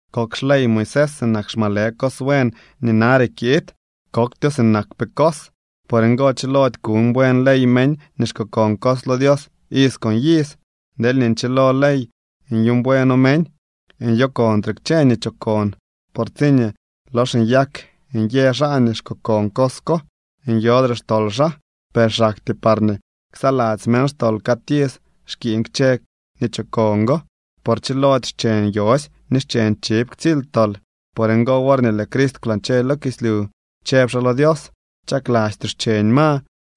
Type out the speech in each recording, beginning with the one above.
Kok xley Moisés sinak xmalë cos buen nii nare kiid. Koktyo sinakpee cos. Por ngo chilody kuuñ buen ley meñ nii xkokon cos lo Dios iz con iz. Deelñee nchilo ley nyuuñ bueno meñ, nyokontre kchë nii chokon. Por tsiñee lox nyak nyë xaa nii xkokon cos ko, nyodre xtol xaa. Per xaktyee parñee ksaladzy meñ xtol cad iz xkiiñ kchë nii chokon go, por chilody xcheñ yosy ni xcheñ chiv ktsily tol. Por ngo, worñee lëë Crist kwlañche lo kislyu, chëb xaa lo Dios: Chaklastyoo xcheñ ma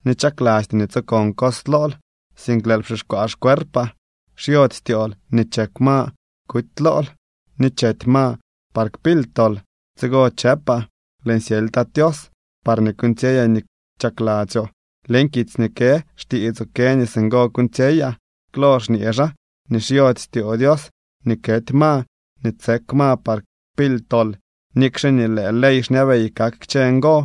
ni chaklastyoo nii tsokon cos lool, sink lëël pxixkwaa xcuerpaa. Xyody styool nii chek ma kuty lool, ni chety ma par kpily tol. Tsigo chëpaa: “Lëën syely, Tat Tios, parñee kuuñtsyeyaa nii chakladzyoo. Leñ kitsy nii kë xtiitsoo kë nii singo kuuñtsyeyaa.” Klo xñee xaa nii xyody styoo Dios nii kety ma ni tsek ma par kpily tol, nikxe nii lëë ley xñabey kak kchë ngo.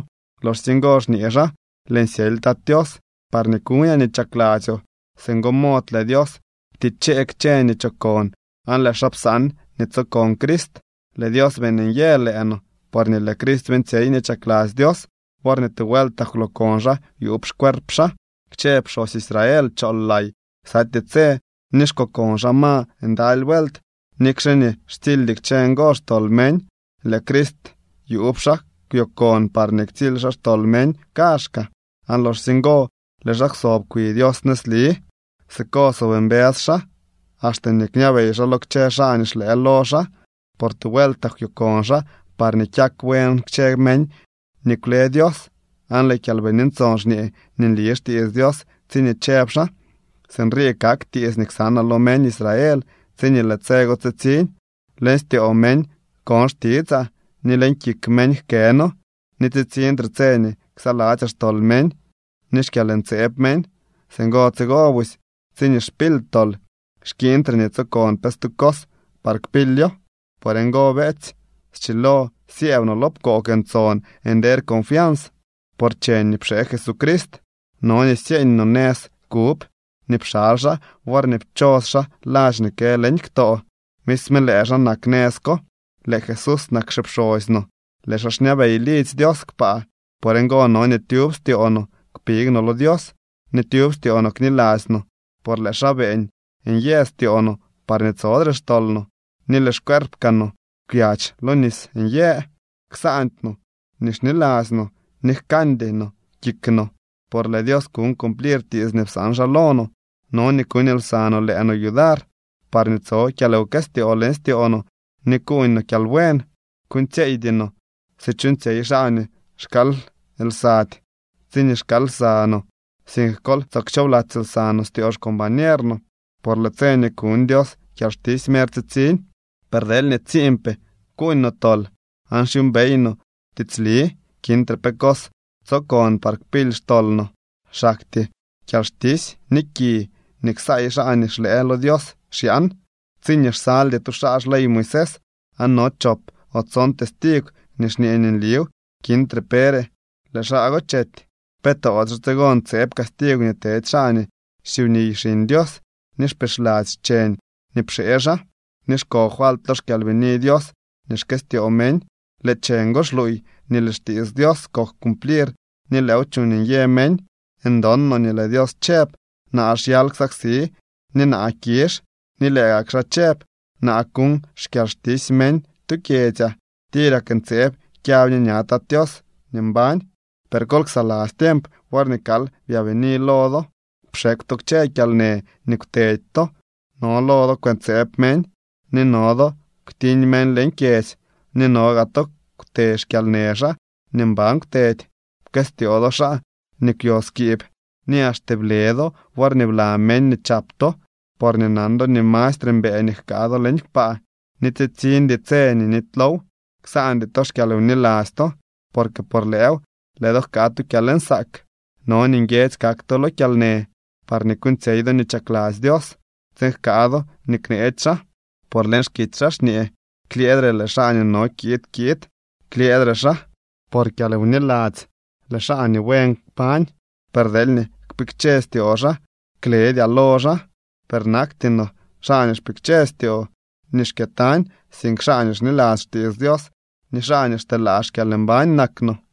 Loxsye ngo xñee xaa: “Lëën syely, Tat Tios, parñee kuñaa nii chakladzyoo.” Singo mod lëë Dios ptichee kchë nii chokon aan lëë xaa psaan nii tsokon Crist. Lëë Dios beeñ nyë lëë no porñee lëë Crist beeñtsyey nii chakladzy Dios worñee tu vueltak kwlookon xaa yuub xcuerp xaa. Kchë pxosy Israel chool lay ksatyee tse ni xkokon xaa ma ndaly vuelt, nikxe nii xtsildy kchë ngo xtol meñ. Lëë Crist, yuub xaa kwyokon parñee ktsily xaa xtol meñ kaazhkaa, aan loxsye ngo lëë xaa kwsob kwi Dios nëzli. Siko sob mbës xaa axte nii kñabey xaa lo kchë xaa nii xlëë lo xaa. Por tu vueltak kwyokon xaa parñee kyak buen kchë meñ nii kwle Dios. Aan lëë Kyalbini Ntson xñee nii nli xtiits Dios tsiñee chëb xaa: Sinrii kak tiits nii ksanaa lo meñ Israel tsiñee lëë tse go tsitsiñ: Leñ styoo meñ kon xtitsaa, ni leñ kik meñ jkëno. Ni tsitsiñtre tse nii ksaladzyaa xtol meñ ni xkyalntseeb meñ. Singo tsigo busy, tsiñee xpily tol, xkiiñtre nii tsokon pe stu cos par kpilyo. Por ngo, beetsy, schilo syëëb no lo pkoog ntson nder confians por cheñ nii pxee Jesucrist. No nii syeeñ no nëz kub nii pxaly xaa worñee pchos xaa ladx nii kë leñ ktoo. Misme lëë xaa nak nëz ko. Lëë Jesús nak xipxosy no. Lëë xaa xñabey lidzy Dios kpaa. Por ngo no nii tyub styoo no kpig no lo Dios ni tyub styoo no kniladzy no, por lëë xaa beeñ nyë styoo no parñee tsodre xtol no, ni lëë xcueerp kaa no kwyadx lo nis nyë. Ksaandy no nii xniladzy no, ni jkandy no kik no, por lëë Dios kuñ cumplir tiits nii psaan xaa lo no. No nii kuuñ lsa no lëë no yudar parñee tso kyalwkëstyoo leñ styoo no ni kuuñ no kyalbuen. Kuuñtsyeeydy no si chuuñtsyey xaa nii xkaal lsady tsiñee xkaal lsa no, sink kol tsoo kchoobladzy lsa no styoo xcombañer no, por lëë tse nii kuñ Dios kyalxtisy mer tsitsiñ. Per deelñee tsiinpee kuuñ no tol, aan xyuumbey no tiitsli, kintre pe cos tsokon par kpily xtol no. Xaktyee kyalxtisy ni ki nii ksaay xaa nii xlëë lo Dios xyaan. Tsiñee xsaldy tu xaa xley Moisés, aan no chop o tson testigw nii xñee nliw, kintre pere, lëë xaa go chety. ¿Pe toodyxe tsigo ntseeb castigw nii tedy xaa nii xsyubniy Xiñ Dios ni xpixladzy cheñ nii pxee xaa, ni xko falt lo xKyalbini Dios nii xkëstyoo meñ? Lëë cheñ go xluuy nii lëë xtiits Dios kok cumplir ni lëëw chuuñ nyë meñ. Ndon no nii lëë Dios chëb: “Naa xyal ksaksi, ni naa kizh.” Ni lëë gak xaa chëb: “Naa kuñ xkyalxtisy meñ tu kyedzyaa.” ¡Tirak ntseeb kyab ñe ña Tat Tios nii mbañ! Per kol ksaladzy tiemp worñee kal byaabini lo do. Pxekw to kchë kyalnë nii kwteedy to. No lo do kwëntseeb meñ, ni no do kwtiñ meñ leñ kyedzy, ni no gaa to kwtee xkyalnë xaa nii mban kwtedy. Pkëstyoo do xaa nii kwyo skiib, ni axte ble do worñee bla meñ nii chap to porñee nan do nii mastre mbëë nii jkaa do leñ kpaa, ni tsitsiñdy tse nii nitylow. Ksaandy to xkyalwniladzy to, porque por lëëw lëë do jkaa tu kyalnsaak. No nii nguiedzy kak to lo kyalnë parñee kuuñtsyey do nii chakladzy Dios tsiin jkaa do nii kneetsy xaa. Por leñ xkitsy xaa xñee: Klyëëdre lëë xaa nii no kiid kiid. Klyëëdre xaa. Por kyalwniladzy lëë xaa nii buen kpañ, per deelñee kpikche styoo xaa, kledyaa lo xaa. Per nakty no xaa nii xpikche styoo ni xkyëtañ, sink xaa nii xniladzy xtiits Dios ni xaa nii xteelaa xkyalmbañ nak no.